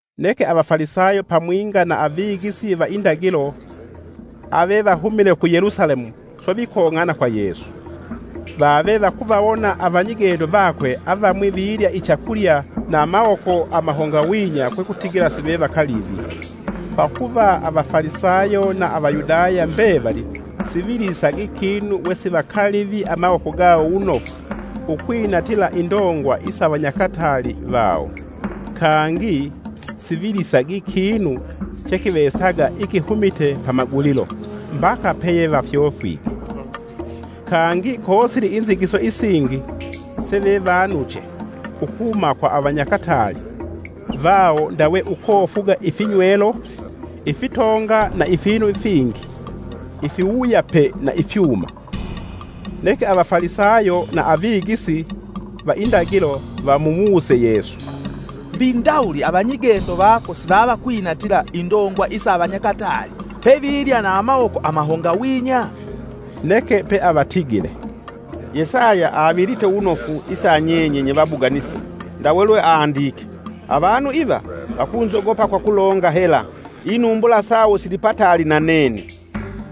Neke Avafalisayo pamwinga na Avigisi va indagilo, avevahumile ku Yelusalemu swe vikong'ana kwa Yesu. Vave vakuvawona avanyigendo vakwe avamwi vilya ichakulya na amawoko amahongawinya kwekutigila sivevakalivi. Pakuva Avafalisayo na Avayudaya mbevali sivilisagi kinu wesivakalivi amawoko gawo wunofu ukwinatila indongwa isa avanyakataali vawo. Kangi, sivilisagi kinu chekivesaga ikitumite pamagulilo, mbaka peyevafyofwige. Kangi kosili inzigiso isingi sevevanuche ukuhuma kwa avanyakataali vawo ndawe ukofuga ifinywelo, ifitonga na ifinu fingi ifiwuyape na ifyuma. Neke Avafalisayo na avigisi va indagilo vamuwuse Yesu, “Mbi ndawuli avanyigendo vako sivavakwinatila indongwa isa avanyakataali, pevilya na amawoko amahongawinya?” Neke peavatigile, “Yesaya avilite wunofu isa nyenye nyevabuganisi ndawe lweandike: ‘Avanu iva vakunzogopa kwakulonga hela, Inumbula sawo silipataali na nene,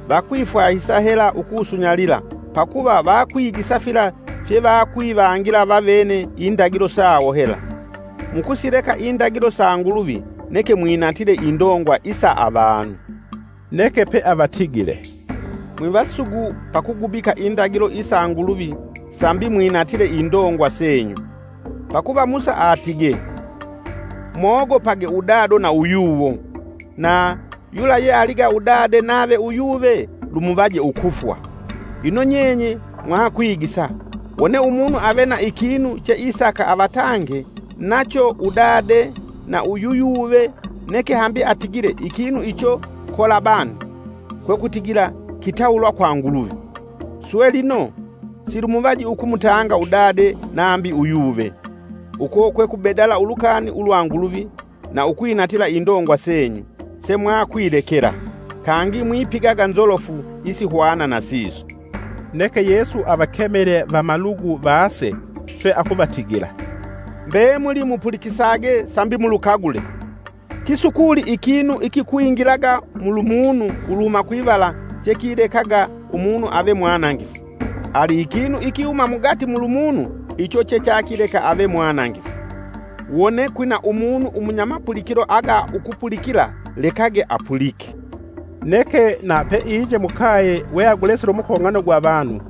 Vakwifwahisa hela ukusunyalila pakuva, vakwigisa fila fye vakwivangila vavene indagilo sawo hela.’ Mukusileka indagilo sa Nguluvi neke mwinatile indongwa isa avanu.” Neke peavatigile, “Mwivasugu pa kugubika indagilo isa Nguluvi sambi mwinatile indongwa senyu! Pakuva Musa atige, ‘Mwogopage udado na uyuwo,’ na, ‘Yula ye aliga udade nave uyuve, lumuvaje ukufwa.’ Ino nyenye mwakwigisa, ‘Wone umunu ave na ikinu cheisaka avatange nacho udade na yuyuve, neke hambi atigile ikinu icho kolabani (kwekutigila kitawulwa kwa Nguluvi), Swe lino silumuvaji ukumutanga udade nambi uyuve.’ Uko kwekubedala ulukani ulwa Nguluvi na ukwinatila indongwa senyu semwakwilekela. Kangi mwipigaga nzolofu isihwana na siso.” Neke Yesu avakemele vamalugu vaase swe akuvatigila, “Mbemuli mupulikisage sambi mulukagule. Kisukuli ikinu ikikwingilaga mulumunu uluhuma kwivala chekilekaga umunu ave mwanangifu, ali ikinu ikihuma mugati mulumunu icho chechakileka ave mwanangifu. [ Wone kwina umunu umunyamapulikilo aga ukupulikila lekage apulike!”] Neke na peinje mukaye weagulesile umukong'ano gwa vanu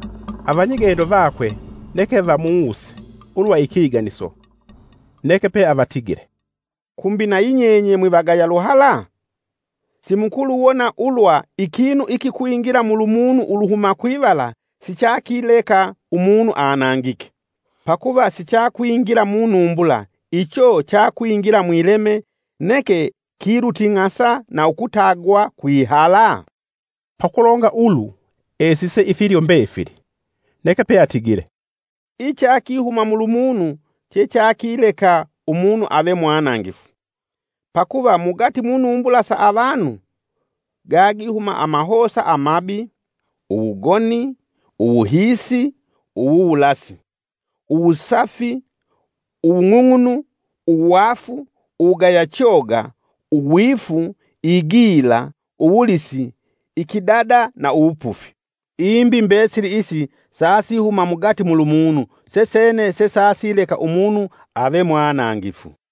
avanyigendo vakwe neke vamuwuse ulwa ikiganiso. Neke peavatigile, “Kumbi nayi nyenye mwivagaya luhala? Simukuluwona ulwa ikinu ikikwingila mulumunu uluhuma kwivala sichakileka umunu anangike, pakuva sichakwingila munumbula, icho chakwingila mwileme neke kiluting'asa na ukutagwa kwihala?” (Pakulonga ulu esise ifilyo mbefili.) Neke peatigile, “Ichakihuma mulumunu che chakileka umunu ave mwanangifu. Pakuva mugati munumbula sa avanu, gagihuma amahosa amabi, uwugoni, uwuhiisi, uwuwulasi, Uwusafi, uwung'ung'unu, uwaafu, uwugaya choga, uwifu, igila, uwulisi, ikidada na uwupufi. Imbi mbesili isi sasihuma mugati mulumunu sesene sesasileka umunu ave mwanangifu.”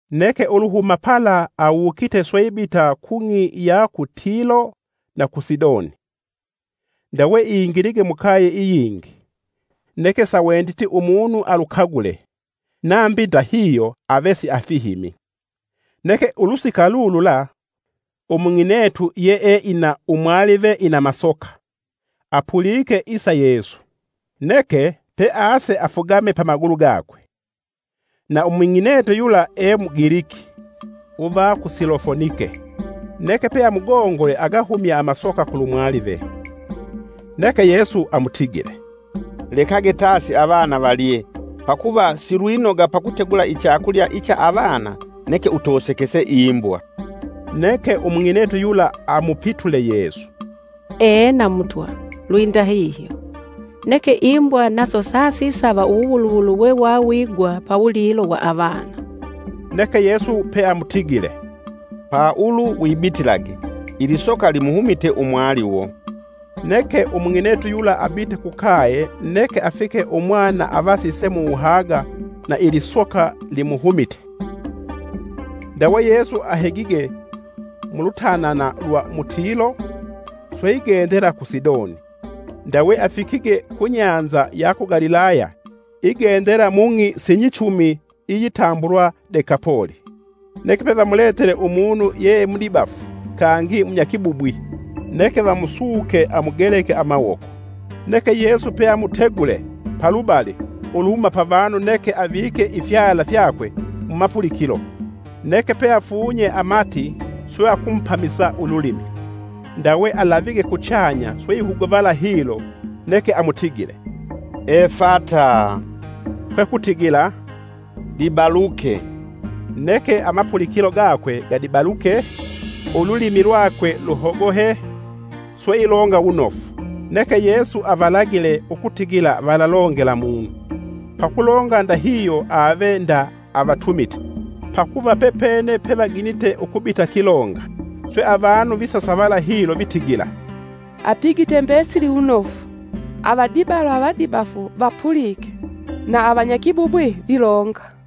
Neke uluhuma pala awukite swe ibita kung'i iya ku Tilo na ku Sidoni. Ndawe ingilige mukaye iyingi, neke sawenditi umunu alu kagule; nambi ndahihyo ave siafihimi. Neke ulusika lulula, umung'inetu, yeeina umwalive ina masoka, apulike isa Yesu. Neke, pease afugame pamagulu gakwe. Na umung'inetu yula e Mugiliki, uva ku Silofonike. Neke peamugongole agahumye amasoka kulumwalive. Neke Yesu amutigile, “Lekage tasi avana valye pakuva silwinoga pakutegula ichakulya icha avana neke utosekese imbwa.” Neke umung'inetu yula amupitule Yesu, “Ena Mutwa, lwindahihyo, neke imbwa naso sasisava uwuwuluwulu wewawigwa pawulilo wa avana.” Neke Yesu peamutigile, “Paulu wibitilage, ilisoka limuhumite umwaliwo!” Neke umung'inetu yula abite kukaye neke afike umwana avasise muwuhaga na ilisoka limuhumite. Ndawe Yesu ahegige mulutanana lwa mu Tilo, swe igendela ku Sidoni, ndawe afikige ku nyanza ya ku Galilaya igendela mung'i sinyichumi iyitambulwa Dekapoli. Neke pevamuletele umunu yeemudibafu kangi munyakibubwi, neke vamusuke amugeleke amawoko. Neke Yesu peamutegule palubali uluhuma pa vanu neke avike ifyala fyakwe mumapulikilo neke peafunye amati swe akumupamisa ululimi. Ndawe alavige alavige kuchanya sweihuguvala hilo neke amutigile, “Efata,” kwekutigila, “Dibaluke.” Neke amapulikilo gakwe gadibaluke, ululimi lwakwe luhogohe, swe ilonga wunofu. Neke Yesu avalagile ukutigila valalongela munu; pakulonga ndahihyo ave nda avatumite pakuva pepene pevaginite ukubitakilonga. Swe avanu visasavala hilo vitigila, “Apigite mbesili wunofu: avadibalwe avadibafu vapulike, na avanyakibubwi vilonga!”